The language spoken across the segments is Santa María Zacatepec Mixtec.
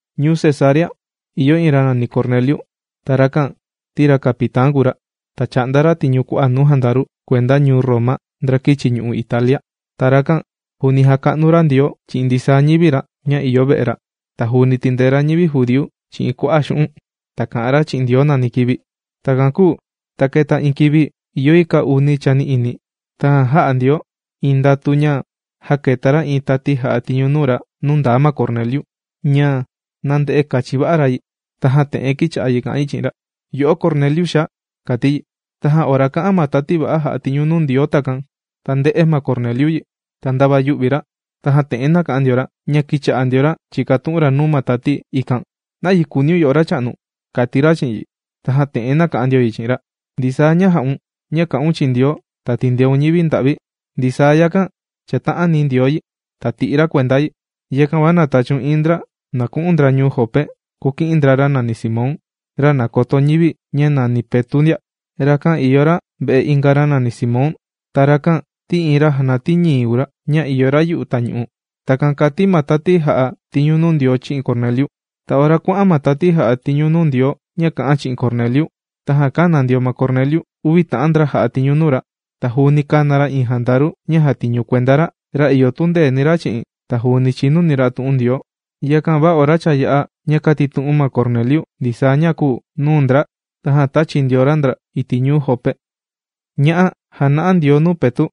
Ñuu Cesarea, ìyo iin ra nàni Corneliu. Ta rakan ti ra capitán kùu ra. Ta chà'nda ra tiñu nuu kua'a' jandaru kuenda ñuu Roma ndra kīchi ñu'u' Italia. Ta rakan juuni jàka'nu ra Ndioo chi'in ndisaa ñivi ra ña ìyo ve'e ra. Ta juuni tìndee ra ñivi judíu chi'in kua'a' xu'un'. Ta kà'an ra chi'in Ndioo nani kivi. Takan kūu ta kēta iin kivi ìyo yi kaa uni chani'ini, tajan jā'a Ndioo iin ndatu ña jāketa ra iin tati jà'a tiñu nuu ra nuu ndaa ma Corneliu ña nānde'e kachin va'a ra yi. Tajan te'en kīcha'a kà'an yi chi'in ra: ―Yo'o Corneliu, xaa ―kàti yi. Tajan ora kā'an ma tati va'a jà'a tiñu nuu Ndioo takan, ta ndē'e ma Corneliu yi, ta ndava yū'vi ra. Tajan te'en nāka'an ndio ra ña kīcha'a ndio ra chìkatu'un ra nuu ma tati ikan: ―¿Nayi kùuniun yo'o Racha'nu? ―kàti ra chi'in yi. Tajan te'en nāka'an ndio yi chi'in ra: ―Ndisaa ña jà'un ña kà'un chi'in Ndioo, ta tìndeun ñivi nda'vi, ndisaa yakan chàta'ani Ndioo yi ta tì'i ra kuenda yi. Yakan va na tachiun iin ndra na ku'un ndra ñuu Jope kuki'in ndra ra nàni Simón, ra nàkoto ñivi ña juuni nàni Petu' ndia. Rakan ìyo ra ve'e inga ra nàni Simón. Ta rakan ti iin ra jànatii ñii kùu ra, ña ìyo ra yu'u tañu'u. ―Takan kàti ma tati jà'a tiñu nuu Ndioo chi'in Corneliu. Ta ora kuà'an ma tati jà'a tiñu nuu Ndioo ña kā'an chi'in Corneliu, tajan kāna ndio ma Corneliu uvi ta'an ndra jà'a tiñu nuu ra. Ta juuni kāna ra iin jandaru ña jàtiñu kuenda ra, ra ìyo tundeeni ra chi'in, ta juuni chìnuni ra tu'un Ndioo. Yakan va ora cha yā'a ña kàtitu'un ma Corneliu ndisaa ña kūu nuu ndra, tajan tāchi ndio ra ndra iti' ñuu Jope. Ña'a jàna'a Ndioo nuu Petu'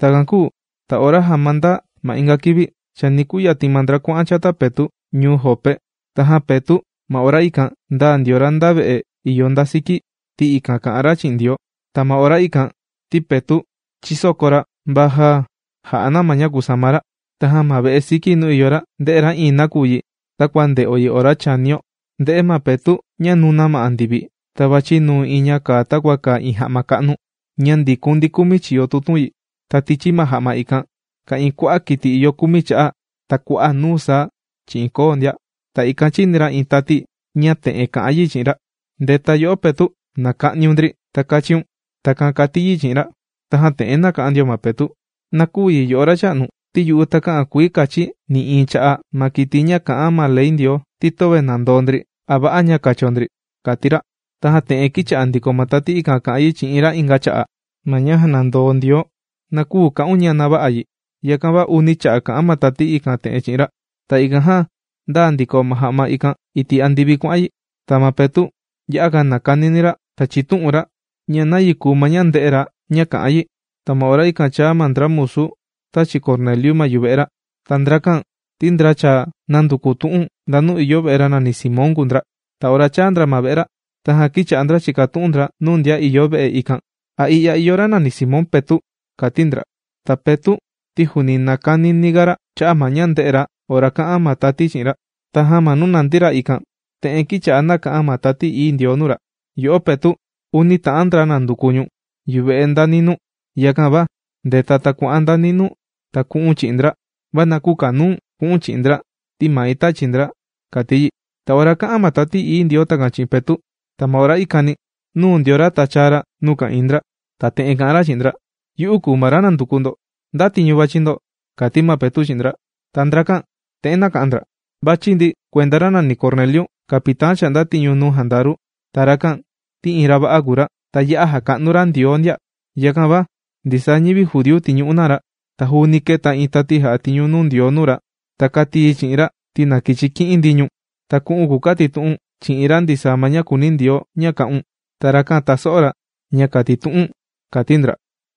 Takan kūu ta ora sama ndaa ma inga kivi, chani kuyatin ma ndra kuà'an chata Petu' ñuu Jope. Tajan Petu' ma ora ikan ndāa ndio ra nda ve'e ìyo nda siki, ti ikan kà'an ra chi'in Ndioo. Ta ma ora ikan ti Petu' chìsoko ra va já jà'a na ma ña kùsama ra. Tajan ma ve'e siki nuu ìyo ra, ndē'e ra iin nakuyi takua ndè'o yi ora chànio. Ndē'e ma Petu' ña nùna ma andivi ta vàchi nuu iin ña kàa takua kàa iin ja'ma ka'nu, ña ndìkun ndi kumi chiyo tutun yi. Ta tichi ma ja'ma ikan ka'ìin kua'a' kiti ìyo kumi cha'a', ta kua'a' nuu saa chi'in koo ndia. Ta ikan chìni ra iin tati ña te'en kà'an yi chi'in ra: ―¡Ndeta yo'o Petu', na ka'niun ndri ta kachiun! ―Takan kàti yi chi'in ra. Tajan te'en nāka'an ndio ma Petu': ―Na küu yi, yo'o Racha'nu, ti yu'u takä'an kuii kachi̱ nï'iin cha'a' ma kiti ña kà'an ma ley Ndioo ti töve nàndoo ndri a va'a ña kacho ndri ―kàti ra. Tajan te'en kīcha'a ndiko ma tati ikan kà'an yi chi'in ra inga cha'a': ―Ma ña jànandoo Ndioo, na küu ka'un ña na vä'a yi. Yakan va uni cha'a' kà'an ma tati ikan te'en chi'in ra. Ta ikan jan ndāa ndiko ma ja'ma ikan iti' andivi, kuà'an yi. Ta ma Petu' ya'a nàkanini ra ta chìtu'un ra ña nayi kùuni ma ña ndē'e ra ka'an yi. Ta ma ora ikan chāa ma ndra musu tāchi Corneliu ma yuve'e ra, ta ndrakan ti ndra cha nānduku tu'un ndanu ìyo ve'e ra nàni Simón kùu ndra. Ta ora chāa ndra ma ve'e ra, tajan kīcha'a ndra chìkatu'un ndra nuu ndian ìyo ve'e ikan: ―¿A i'ya ìyo ra nàni Simón Petu'? ―kàti ndra. Ta Petu' ti juuni nàkanini ga ra cha'a' ma ña ndē'e ra ora kā'an ma tati chi'in ra, tajan ma nuu nàndi ra ikan te'en kīcha'a nàka'an Tati Ií Ndioo nuu ra: ―Yo'o Petu', uni ta'an ndra nànduku ñu̱n yuve'e nda ninuu. Yakan va ndeta ta kua'an nda ninuu ta ka'un chi'in ndra, va na kükanuu̱n ku'u̱n chi'in ndra, ti mai, tāchi ndra ―kàti yi. Ta ora kā'an ma Tati Ií Ndioo takan chi'in ma Petu', ta ma ora ikani nūu ndio ra ta chāa ra nuu ka'ìin ndra. Ta te'en kà'an ra chi'in ndra: ―Yu'u kùu ma ra nànduku ndo. ¿Nda tiñu vàchi ndo? ―kàti ma Petu' chi'in ndra. Ta ndrakan te'en nāka'an ndra: ―Vàchi ndi kuenda ra nàni Corneliu, capitán chà'nda tiñu nuu jandaru. Ta rakan ti iin ra va'a kùu ra, ta ya'a jàka'nu ra Ndioo ndia. Yakan va ndisaa ñivi judíu tìñu'u na ra. Ta juuni kēta iin tati jà'a tiñu nuu Ndioo nuu ra. Ta kāti yi chi'in ra ti na kichi ki'in ndi ñu̱n, ta ku'u̱n kukatitu'u̱n chi'in ra ndisaa ma ña kùuni Ndioo ña kà'un. Ta rakan taso'o ra ña kàtitu'u̱n ―kàti ndra.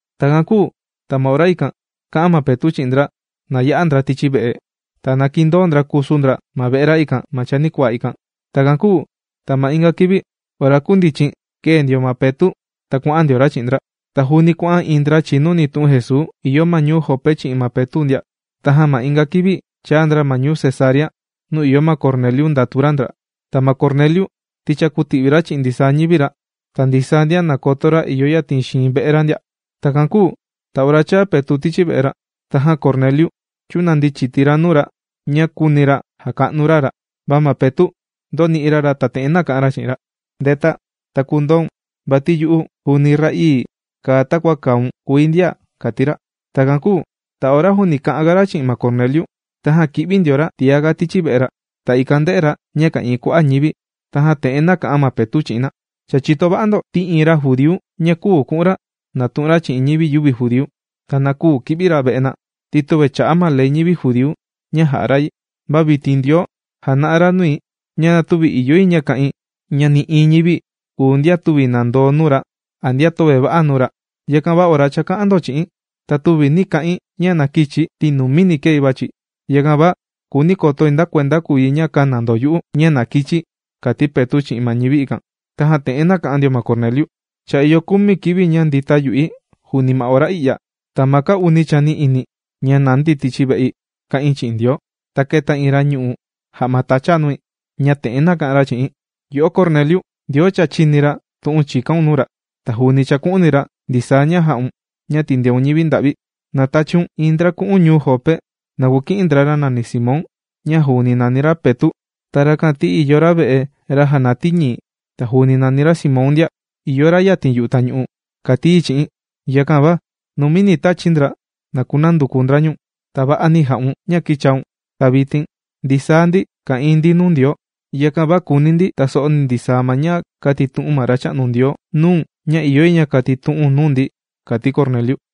Takan kūu ta ma ora ikan, kā'an ma Petu' chi'in ndra, na ya'a ndra tichi ve'e. Ta na kindoo ndra kusu ndra ma ve'e ra ikan ma chanikuaa ikan. Takan kūu ta ma inga kivi, ora kūndichin, kēe ndio ma Petu' ta kuà'an ndio ra chi'in ndra. Ta juuni kuà'an iin ndra chìnuni tu'un Jesuu ìyo ma ñuu Jope chi'in ma Petu' ndia. Tajan ma inga kivi chāa ndra ma ñuu Cesarea, nuu ìyo ma Corneliu ndàtu ra ndra. Ta ma Corneliu ti cha kūti'vi ra chi'in ndisaa ñivi ra, ta ndisaa ndian nàkoto ra ìyo yatin xiin ve'e ra ndia. Takan kūu ta ora cha yā'a Petu' tichi ve'e ra, tajan ma Corneliu chūnandi chiti ra nuu ra ña kūuni ra jaka'nu ra ra. Va ma Petu' ndōni'i ra ra ta te'en nāka'an ra chi'in ra: ―¡Ndeta, ta kundaun vati yu'u juuni ra'ii kàa takua kàun, kùi ndia! ―kàti ra. Takan kūu ta ora juuni kà'an ga ra chi'in ma Corneliu, tajan kī'vi ndio ra tiá tichi ve'e ra. Ta ikan ndē'e ra ña ka'ìin ti'vi kua'a' ñivi. Tajan te'en nāka'an ma Petu' chi'in na: ―Cha chìto va'a ndo ti iin ra judíu na küu ku'un ra natu'un ra chi'in ñivi yüvi judíu. Ta na küu ki'vi ra ve'e na, ti töve chà'a ma Ley ñivi judíu ña jà'a ra yi. Va vitin Ndioo jàna'a nui ña na tüvi ìyo yi ña ka'in ña nï'iin ñivi kùu ndian tüvi nàndoo nuu ra a ndian töve va'a nuu ra. Yakan va ora chāka'an ndo chi'i̱n, ta tüvi nī ka'in ña na kïchi̱ ti numini kēi vàchi̱. Yakan va kùuni̱ kotoi nda kuenda kùu yi ña kāna ndo yu'u ña na kichi̱ ―kàti ma Petu' chi'in ma ñivi ikan. Tajan te'en nāka'an ndio ma Corneliu: ―Cha ìyo kumi kivi ña ndīta yu'i juuni ma ora i'ya, ta ma kaa uni chani'ini ña nandi tichi ve'i kā'in chi'in Ndioo, ta kēta iin ra ñù'u ja'ma tacha nui, ña te'en nāka'an yi chi'i̱n: “Yo'o Corneliu, Ndioo cha chīni ra tu'un chìkaun nuu ra. Ta juuni chàku'uni ra ndisaa ña jà'un ña tìndeun ñivi nda'vi. Na tachiun iin ndra ku'un ñuu Jope na kuki'in ndra ra Simón ña juuni nàni ra Petu'. Ta rakan ti ìyo ra ve'e ra jànatii ñii. Ta juuni nàni ra Simón ndia. Ìyo ra yatin yu'u tañu'u”, kàti yi chi'i̱n. Yakan va numini tāchi̱ ndra na kunanduku ndra ñu̱n. Ta va'ani jà'un ña kīchaun. Ta vitin ndisaa ndi ka'ìin nuu Ndioo. Yakan va kùuni ndi taso'o ndi ndisaa ma ña kātitu'un ma Racha'nu Ndioo nuu̱n ña ìyo yi ña katitu'u̱n nuu ndi ―kàti Corneliu.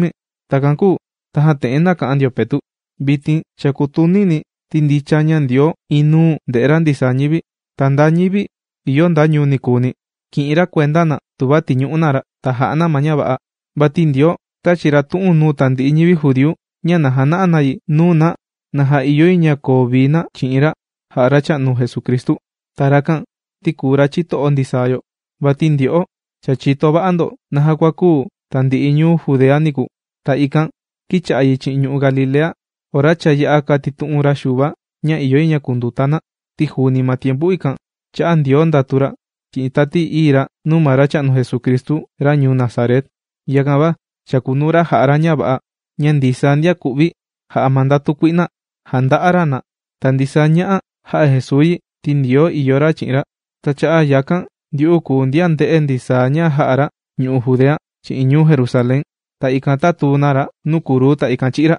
Takan kūu tajan te'en nāka'an ndio Petu': ―Vitin cha kùtunini̱ ti ndicha ña Ndioo inuu ndè'e ra ndisaa ñivi. Ta nda ñivi ìyo nda ñuu nikuuni kì'in ra kuenda na tuva tìñu'u na ra, ta jà'a na ma ña va'a. Vati Ndioo tāchi ra tu'un nuu tandi'i ñivi judíu ña na jana'a na yi nuu na naja ìyo yi na koo vii na chi'in ra jā'a Racha'nu Jesucristu. Ta rakan ti kùu ra chito'o ndisaa yo. Vati ndyo'o cha chìto va'a ndo naja kua kūu tandi'i ñu'u' Judea niku. Ta ikan kīcha'a yi chi'in ñu'u' Galilea ora cha yā'a kātitu'un Xuva ña ìyo yi ña kunduta na. Ti juuni ma tiempu ikan, chā'a Ndioo ndatu ra chi'in Tati Ií ra nuu ma Racha'nu Jesucristu ra ñuu Nazaret. Yakan va chàkunuu ra jà'a ra ña va'a. Ña ndisaa ndian ku'vi jà'a ma ndatu kui'na, jànda'a ra na. Ta ndisaa ña'a jā'a Jesuu yi ti Ndioo ìyo ra chi'in ra. Ta cha'a' yakan ndyu'u kùu ndian ndē'e ndi ndisaa ña jā'a ra ñu'u' Judea chi'in ñuu Jerusalén. Ta ikan tātuu na ra nuu kruu, ta ikan chī'í ra.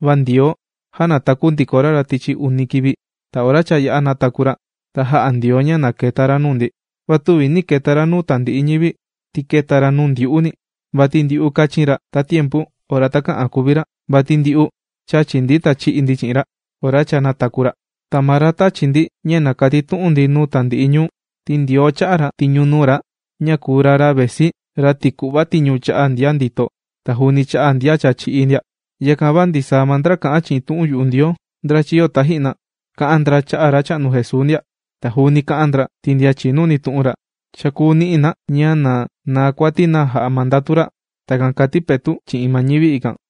Va Ndioo, jānataku ndiko ra ra tichi uni kivi. Ta ora cha yā'a nàtaku ndiko ra, ta jā'a Ndioo ña na keta ra nuu ndi. Va tüvi nī keta ra nuu tandi'i ñivi, ti kēta ra nuu ndyu'uni. Vati ndyu'u kāchin ra tatiempu ora takä'an kuvi ra, vati ndyu'u chàchi ndi ta chì'i ndi chi'in ra ora cha nātaku ra. Ta maa ra tāchi ndi ña na katitu'un ndi nuu tandi'i ñuu, ti Ndioo chā'a ra tiñu nuu ra ña kùu ra, ra vesi, ra tìku'va tiñu cha'a' ndian ndito, ta juuni cha'a' ndian cha chī'í ndia. Yakan va ndisaa ma ndra kà'an chi'in tu'un yu'u Ndioo, ndra chīyo taji'na, kā'an ndra cha'a' Racha'nu Jesuu ndia. Ta juuni kā'an ndra ti ndian chìnuni tu'un ra, cha kùu ni'i na ña na naa kuati na jà'a ma ndatu ra. ―Takan kàti Petu' chi'in ma ñivi ikan.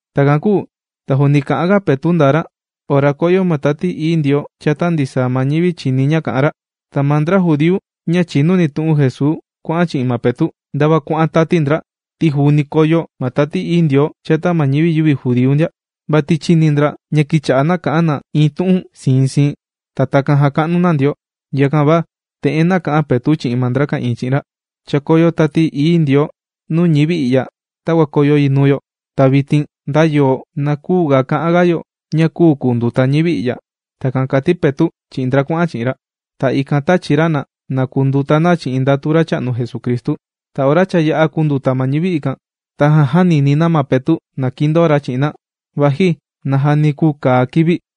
Takan kūu ta juuni kà'anga Petu' ndaa ra, ora kōyo ma Tati Ií Ndioo chata ndisaa ma ñivi chìni ña kà'an ra. Ta ma ndra judíu ña chìnuni tu'un Jesuu kuà'an chi'in ma Petu', ndava kuà'an tati ndra, ti juuni kōyo ma Tati Ií Ndioo chata ma ñivi yüvi judíu ndia. Vati chīni ndra ña kīcha'a na kà'an na iin tu'un siin siin, ta takan jàka'nu na Ndioo. Yakan va te'en nāka'an Petu' chi'in ndra ka'ìin chi'in ra: ―Cha kōyo Tati Ií Ndioo nuu ñivi i'ya takua kōyo yi nuu yo. Ta vitin nda yo, na küu ga ka'an ga yo ña küu kunduta ñivi i'ya. ―Takan kàti Petu' chi'in ndra kuà'an chi'in ra. Ta ikan tāchi ra na, na kunduta na chi'in ndatu Racha'nu Jesucristu. Ta ora cha yā'a kūnduta ma ñivi ikan, tajan jānini na ma Petu' na kindoo ra chi'in na, vaji najani kùu kàa kivi.